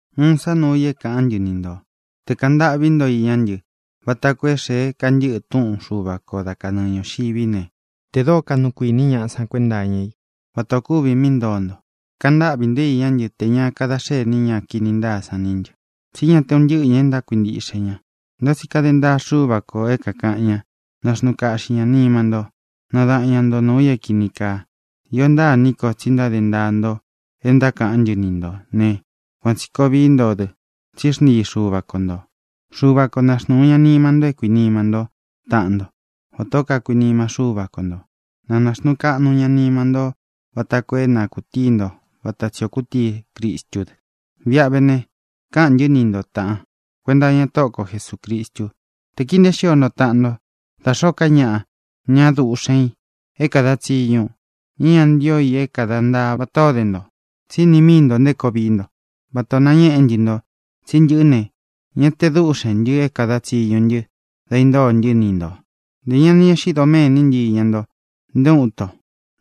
Uun sá nuu i é kāꞌán ntɨ ni ntō: Tē kaꞌan ntáꞌvī nto iñá ntɨ, vata koo é xēe kantɨ́ꞌɨ túꞌun Xuva kō dá kanɨɨ ñūxiví ne, tē dóo kaꞌnu kuīní ñaꞌa san kuénta iña í vata ō kúvi mí ntoo nto. Kaꞌan ntáꞌvī ntó iñá ntɨ tē ña kadá xení ña kini ntáa sán ntɨ, tsí ña te un ntɨ́ꞌɨ ñāꞌa e ntákuintiꞌxe ña. Ntá tsi kade ntaa Xúva kō é kākaꞌan ña. Naxnuu kaꞌxi ñā nima ntó; nadaꞌan ña nto nuū i é kīni kaa. Iō ntáa iní ko tsi ntáde ntaa nto e ntákaꞌán ntɨ ni ntō né, kuan tsī koo vií nto dɨ, tsí xntii Xuva ko ntō. Xuva ko na xnūu ña nima nto é kuīnima ntó taꞌan nto vatā ó kakuinima Xúva ko ntō. Na nāxnuu kaꞌnu ña nima ntó vata koo é na kūtíi nto vata tsī o kutíi Cristú dɨ. Viꞌa ve ne, káꞌān ntɨ́ ni nto, tāꞌan, kuenta iña Tóꞌo ko Jesūcristu, te kii nteé xio nto taꞌan nto da xōó ka ñaꞌa, ña duꞌxen ī é kāda tsiñu, ña é ña ntío i é kada ntaa vatā ó de nto. Tsí ini míi ntō nté koo vií nto, vatā o nañéꞌe ntɨ́ nto. Tsi ntɨꞌɨ́ ne, ña te dúꞌxēn ntɨ é kāda tsiñu ntɨ dá īntóo ntɨ́ ni ntō. Ntē ña ni eꞌxí doméni ntɨ́ iña nto nté uun nto.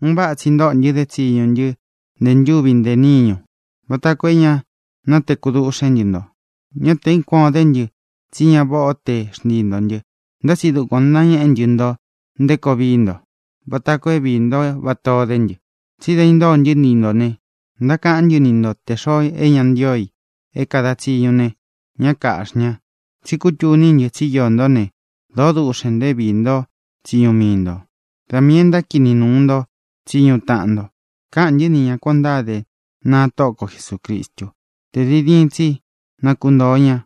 Un váꞌa tsi ntóꞌo ntɨ dé tsiñu ntɨ́ ntē ntúvi ntē níñu vata koo é ña natekú duꞌxén ntɨ nto. Ñá tē é kuān o dé ntɨ tsi ña váꞌa o te xntii ntō ntɨ́, ntá tsi dukuan ō nañéꞌe ntɨ́ nto nté koo vií nto vata koo é viī ntó vatā ó de ntɨ. Tsi da intóo ntɨ́ ni ntō ne, ntákaꞌán ntɨ ni ntō te xoo é ñā ntío i é kāda tsiñu ne, ñá kāꞌxi ña. Tsi kútuní ntɨ tsí iō ntó ne, dōó duꞌxen ntō é viī ntó tsiñu mii ntō; da miī e ntákini nuu nto tsiñu taꞌan nto. Káꞌān ntɨ́ ni ña kuān o ntáde, naa Tóꞌo ko Jesūcristú, te diin diin tsi na kuntōo ña,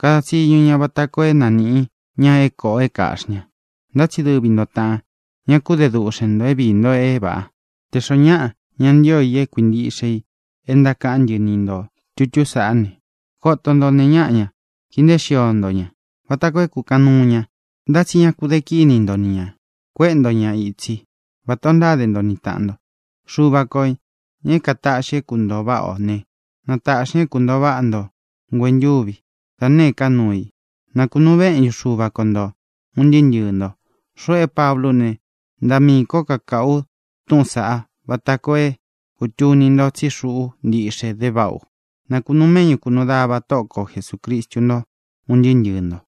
kada tsiñu ña vata koo é nanīꞌi ña é kōꞌo é kāꞌxi ña. Ntá tsi dɨvi nto, tāꞌan, ñá ku de duꞌxen ntō é viī nto é vāꞌa. Tē xoó ñaꞌa ña ntío i é kuīntiꞌxe i e ntákaꞌán ntɨ ni ntō tutú saꞌá ne, koto nto nēe ñáꞌa ña. Kii nteé xio nto ña vata koo é kūkaꞌan nuu ña. Ntá tsi ña ku de kíni nto ni ñā. Kuéꞌe nto ña itsi, vatā o ntáde nto ni tāꞌan nto. Xuva ko, ñā é kātaꞌxi é kūntoo váꞌa ō ne, na tāꞌxi ña é kūntoo váꞌa nto nguentúvi, da nēé ka nuu i. Na kūnuu méꞌñu Xuva ko nto, ūn ntɨɨ́ ntɨɨ̄ nto. Xuꞌu é Pablú u ne, ntaꞌa miī kó kakāꞌu u túꞌūn saꞌá vata koo é kūtuni nto tsí xuꞌú ntiꞌxe dé váꞌa u. Na kūnuu méꞌñu kūnuu dava Tóꞌo ko Jesūcristu nto, un ntɨɨ́ ntɨɨ̄ nto.